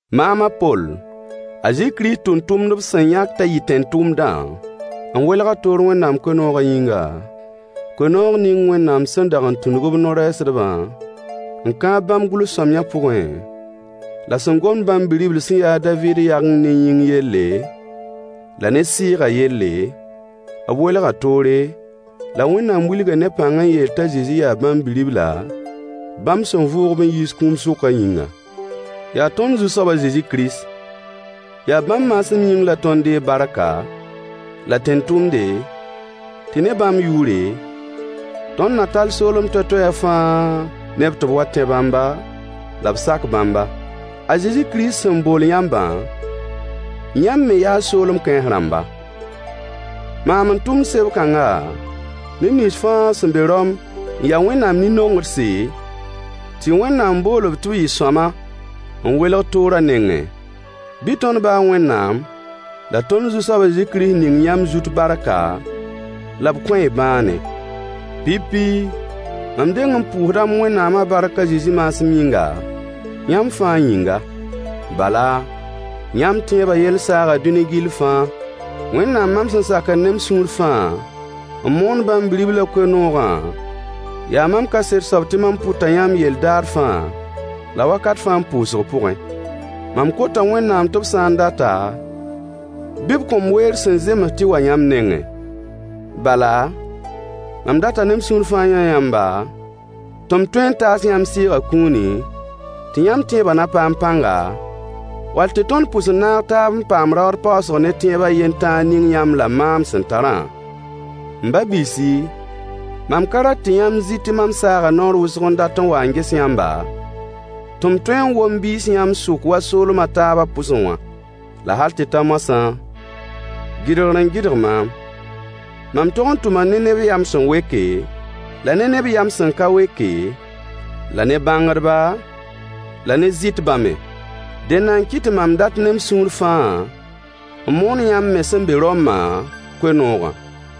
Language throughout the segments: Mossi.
Maam a Poll, a Zezi Kirist tʋmtʋmd b sẽn yãk t'a yɩ tẽn-tʋmdã, n welg-a toor Wẽnnaam koe-noogã yĩnga, koe-noog ning Wẽnnaam sẽn dag n tũnug b no-rɛɛsdbã n kãab bãmb gʋls-sõamyã pʋgẽ, la sẽn gomd bãmb Bi-ribl sẽn ya a Daviid yageng ne yĩng yelle, la ne sɩɩgã yelle, b welga toore, la Wẽnnaam wilga ne pãng n yeel t'a Zezi yaa Bãmb Bi-ribla, bãmb sẽn vʋʋg-b n yiis kũum sʋkã yĩngã. Yaa tõnd Zu-soab a Zezi Kirist. Yaa bãmb maasem yĩng la tõnd deeg barka, la tẽn-tʋmde, tɩ ne bãmb yʋʋre, tõnd na tall soolem toay-toayã fãa neb tɩ b wa tẽ Bãmba, la b sak Bãmba. A Zezi Kirist sẽn bool yãmbã, yãmb me yaa soolem kãens rãmba. Maam n tʋmd seb-kãnga neb nins fãa sẽn be Rom n ya Wẽnnaam nin-nongdse, tɩ Wẽnnaam bool-b tɩ b yɩ sõama n welg toorã nengẽ: Bɩ tõnd ba a Wẽnnaam la tõnd Zu-soab a Zezi Kirist ning yãmb zut barka la b kõ-y bãane. Pipi, mam deng n pʋʋsda m Wẽnnaamã bark a Zezi maasem yĩnga, yãmb fãa yĩnga. Bala, yãmb tẽebã yell saaga dũni gill fãa. Wẽnnaam mam sẽn sakd ne m sũur fãa, n moond bãmb bi-riblã koe-noogã yaa mam kaset soab tɩ mam pʋta yãmb yell daar fãa, la wakat fãa m pʋʋsg pʋgẽ. Mam kota Wẽnnaam tɩ b sã n data, bɩ b kõ-m weer sẽn zems tɩ wa yãmb nengẽ. Bala, mam data ne m sũur fãa n yã yãmba, tɩ m tõe n taas yãmb Sɩɩgã kũuni, tɩ yãmb tẽebã na paam pãnga, wall tɩ tõnd pʋs n naag taab n paam raood paoosg ne tẽeb a yen tãa ning yãmb la maam sẽn tarã. M ba-biisi, mam ka rat tɩ yãmb zɩ tɩ mam saaga naoor yak n dat n wa n ges yãmba, tɩ m tõe n wom biis yãmb sʋk wa soolem a taabã pʋsẽ wã. La hal tɩ ta moasã, gɩdgr n gɩdg maam. Mam tog n tʋma ne neb yam sẽn weke, la ne neb yam sẽn ka weke, la ne bãngdba la ne zɩtbã me. Dẽnda n kɩt tɩ mam dat ne n sũur fãa n moon yãmb me sẽn be Rommã koe-noogã.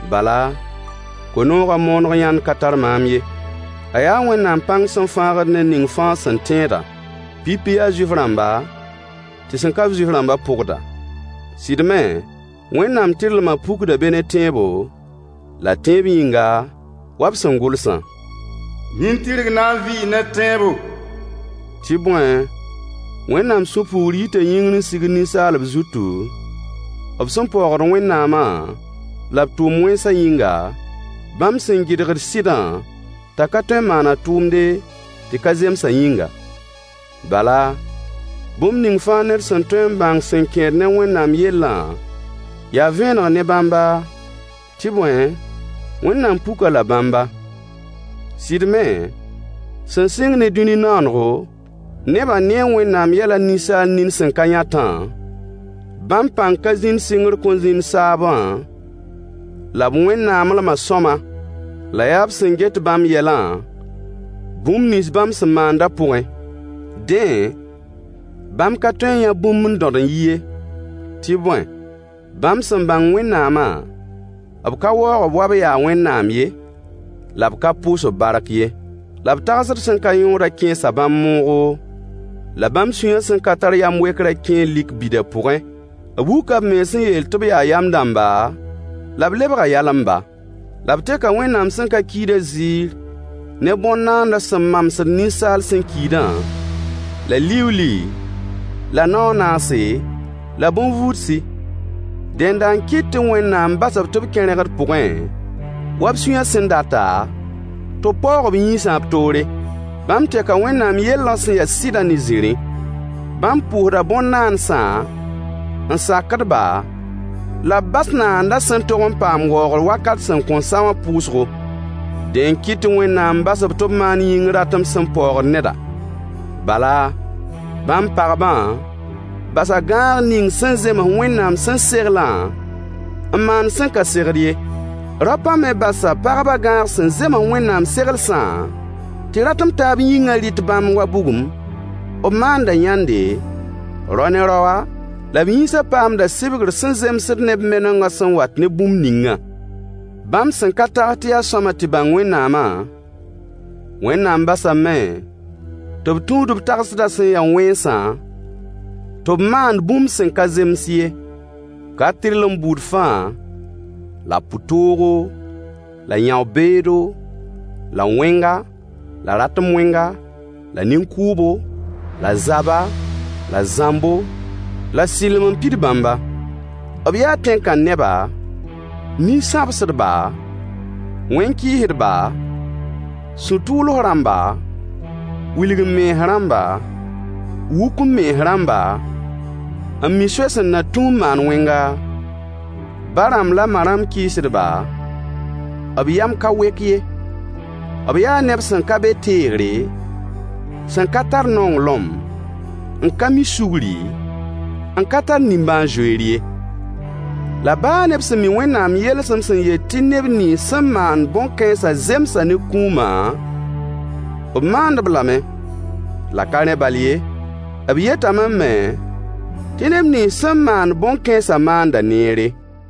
Bala, koe-noogã mooneg yãnd ka tar maam ye. A yaa Wẽnnaam pãng sẽn fãagd ned ning fãa sẽn tẽeda: Pipi yaa Zuif-rãmba, tɩ sẽn ka-b Zuif-rãmbã pʋgda. Sɩd me, Wẽnnaam tɩrlmã pukda be ne tẽebo, la tẽeb yĩnga, wa b sẽn gʋlsã: Nin-tɩrg na vɩ ne tẽebo. Tɩ bõe, Wẽnnaam sũ-puugr yita yĩngr n sigd ninsaalb zutu, b sẽn paoogd Wẽnnaamã la b tʋʋm-wẽnsã yĩnga, bãmb sẽn gɩdgd sɩdã t'a ka tõe n maan a tʋʋmde, tɩ ka zemsã yĩnga. Bala, bũmb ning fãa ned sẽn tõe n bãng sẽn kẽed ne Wẽnnaam yellã ya vẽeneg ne bãmba, tɩ bõe, Wẽnnaam puk-a la bãmba. Sɩd me, sẽn sɩng ne dũni naanego, nebã nee Wẽnnaam yɛlã ninsaal nin sẽn ka yãtã, bãmb pãng ka zĩnd sɩngr kõn zĩnd saabã la b Wẽnnaamlemã sõama. La yaa b sẽn get bãmb yɛlã, bũmb nins bãmb sẽn maandã pʋgẽ. Dẽ, bãmb ka tõe n yã bũmb n dõd n yi ye, tɩ bõe, bãmb sẽn bãng Wẽnnaamã, b ka waoog-b wa b yaa Wẽnnaam ye, la b ka pʋʋs-b bark ye. La b tagsd sẽn ka yõodã kẽesa bãmb moogo, la bãmb sũyã sẽn ka tar yãm-wekrã kẽe lik bida pʋgẽ. B wuka mens n yeel tɩ b yaa yam dãmbã, la b lebga yalemba. La b teka Wẽnnaam sẽn ka kiidã ziir ne bõn-naands sẽn mamsd ninsaal sẽn kiidã, la liuuli, la nao a naase, la bõn-vuudsi. Dẽnda n kɩt tɩ Wẽnnaam bas-b tɩ b kẽ rẽgd pʋgẽ, wa b sũyã sẽn data, tɩ b paoog b yĩnsã b toore. Bãmb teka Wẽnnaam yellã sẽn ya sɩdã ne zĩrĩ. Bãmb pʋʋsda bõn-naandsã n sakd-ba, la b bas Naandã sẽn tog n paam waoogr wakat sẽn kõn a wã pʋʋsgo. Dẽ n kɩt tɩ Wẽnnaam bas-b tɩ b maan yĩng ratem sẽn paoogd neda. Bala, bãmb pagbã basa gãag ning sẽn zems Wẽnnaam sẽn seglã n maand sẽn ka segd ye. Raopã me basa pagbã gãag sẽn zems Wẽnnaam seglsã, tɩ ratem taab yĩngã rɩt bãmb wa bugum. B maanda yãnde, rao ne raoa, la b yĩnsã paamda sɩbgr sẽn zemsd ne b menengã sẽn wat ne bũmb ningã. Bãmb sẽn ka tags tɩ yaa sõama tɩ bãng Wẽnnaamã, Wẽnnaam basame tɩ b tũud b tagsdã sẽn ya wẽnsã, tɩ b maand bũmb sẽn ka zems ye. Ka-tɩrlem buud fãa, la pʋ-toogo, la yão-beedo, la wẽnga, la ratem-wẽnga, la nin-kʋʋbo, la zaba, la zãmbo, la sɩlem n pid bãmba. B yaa tẽn-kãn-neba, nin-sãbsdba, wẽn-kɩɩsdbã, sũ-tʋʋls rãmba, wilg-m-mens rãmba, wuk-m-mens rãmba, n mi soay sẽn na tũ n maan wẽnga, ba-rãmb la ma-rãmb kɩɩsdba, b yam ka wek ye. B yaa neb sẽn ka be teegre, sẽn ka tar nonglem, n ka mi sugri, n ka tar nimbãan-zoeere ye. La baa ne b sẽn mi Wẽnnaam yelsem sẽn yet tɩ neb nins sẽn maand bõn-kãensã zemsa ne kũumã, b maand-b lame. La ka rẽ bal ye, b yetame me tɩ neb nins sẽn maand bõn-kãensã maanda neere.